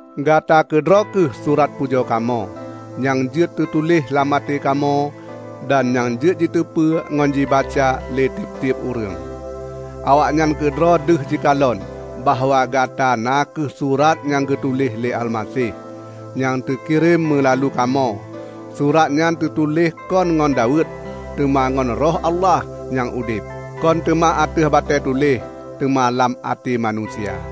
Gata keudroe kheueh surat pujoe kamoe, nyang jeuet teutuléh lam até kamoe dan nyang jeuet jiteupeu ngon jibaca lé tieb-tieb ureuëng. Awaknyan keudroe deuh jikalon bahwa Gata na kheueh surat nyang geutuléh lé Almaseh, nyang teukirém meulalu kamoe. Surat nyan teutuléh kon ngon daweuet, teuma ngon Roh Allah nyang udeb; kon teuma ateueh batée tuléh, teuma lam até manusia.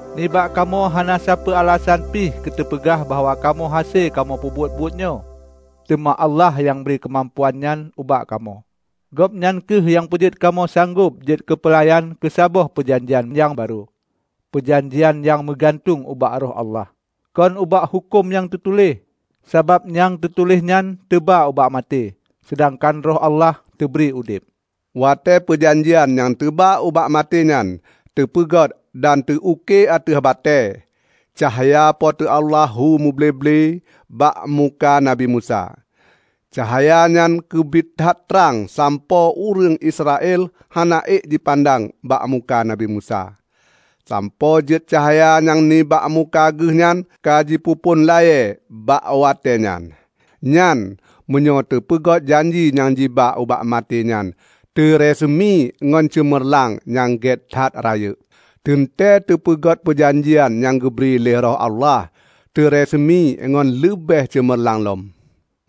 Nibak kamoe hana sapeue alasan pi keuteupeugah bahwa kamoe hase kamoe peubuet buet nyoe, teuma Allah nyang bri keumampuan nyan ubak kamoe. Gobnyan kheueh nyang peujeuet kamoe sanggob jeuet keupeulayan keusaboh peujanjian nyang barô; peujanjian nyang meugantueng ubak Roh Allah, kon bak huköm nyang teutuléh. Sabab nyang teutuléh nyan teuba ubak maté, seudangkan Roh Allah teubri udeb. Watée peujanjian nyang teuba ubak maté nyan teupeugét dan teu uke ateueh batée, cahya Po teu Allah hu muble-ble bak muka Nabi Musa. Cahaya nyan keubiet that trang sampoe ureuëng Israel hana ék jipandang bak muka Nabi Musa, sampoe jeuet cahya nyang nibak muka geuh nyan ka jipeuphon layée bak watée nyan. Nyan, meunyoe teupeugét janji nyang jiba ubak maté nyan teureuseumi ngon ceumeurlang nyang gét that rayeuk, teuntée teupeugét peujanjian nyang geubri lé Roh Allah, teureuseumi ngon leubeh ceumeurlang lom.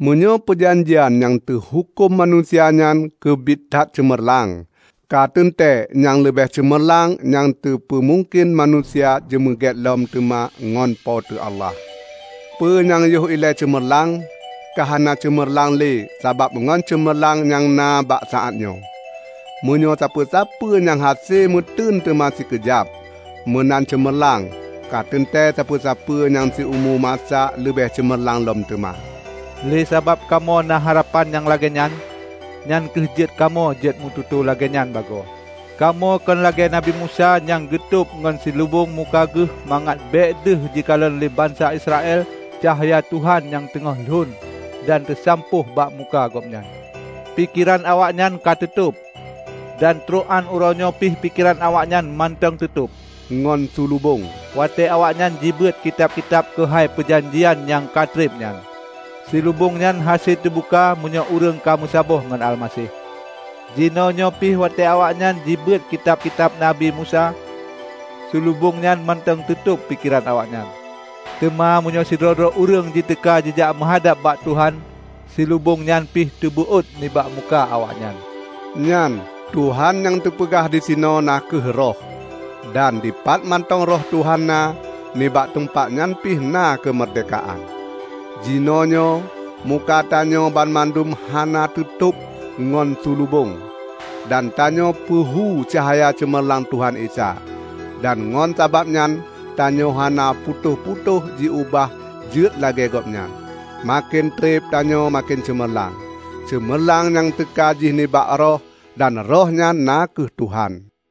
Meunyoe peujanjian nyang teuhuköm manusia nyan keubit that ceumeurlang, ka teuntée nyang leubeh ceumeurlang nyang teupeu mungken manusia jimeugét lom teuma ngon Po teu Allah. Peue nyang yoh ilée ceumeurlang, ka hana ceumeurlang le sabab ngon ceumeurlang nyang na bak saát nyoe. Meunyoe sapeue-sapeue nyang hase meuteun teuma sikeujab, meunan ceumeurlang, ka teuntée sapeue-sapeue nyang siumu masa leubeh ceumeurlang lom teuma. Lé sabab kamoe na harapan nyang lagée nyan, nyang kheueh jeuet kamoe jeuet meututoe lagée nyan bagoe. Kamoe kon lagée Nabi Musa nyang geutôb ngon silubong muka geuh mangat bék deuh jikalon le bansa Israel cahya Tuhan nyang teungoh lon dan teusampôh bak muka gobnyan. Pikeran awaknyan ka teutôb. Dan trok án uroenyoe pi pikeran awaknyan mantong teutôb ngon sulubong watée awaknyan jibeuet kitab-kitab keuhai peujanjian nyang ka treb nyan. Sulubong nyan hase teubuka meunyoe ureuëng ka meusaboh ngon Almaseh. Jinoenyoe pi, watée awaknyan jibeuet kitab-kitab Nabi Musa, sulubong nyan mantong teutôb pikeran awaknyan. Teuma meunyoe sidroe-droe ureuëng jiteuka jijak meuhadab bak Tuhan, sulubong nyan pi teubeuôt nibak muka awaknyan. Nyan, Tuhan nyang teupeugah disinoe na kheueh Roh. Dan dipat mantong Roh Tuhan na, nibak teumpat nyan pih na keumeurdehkaan. Jinoenyoe muka tanyoe banmandum hana teutôb ngon sulubong, dan tanyoe peuhu cahya ceumerlang Tuhan Isa. Dan ngon sabab nyan tanyoe hana putôh-putôh jiubah jeuet lagée Gobnyan; maken treb tanyoe maken ceumeurlang. Ceumeurlang nyan teuka jih nibak Roh, dan Roh nyan na kheueh Tuhan.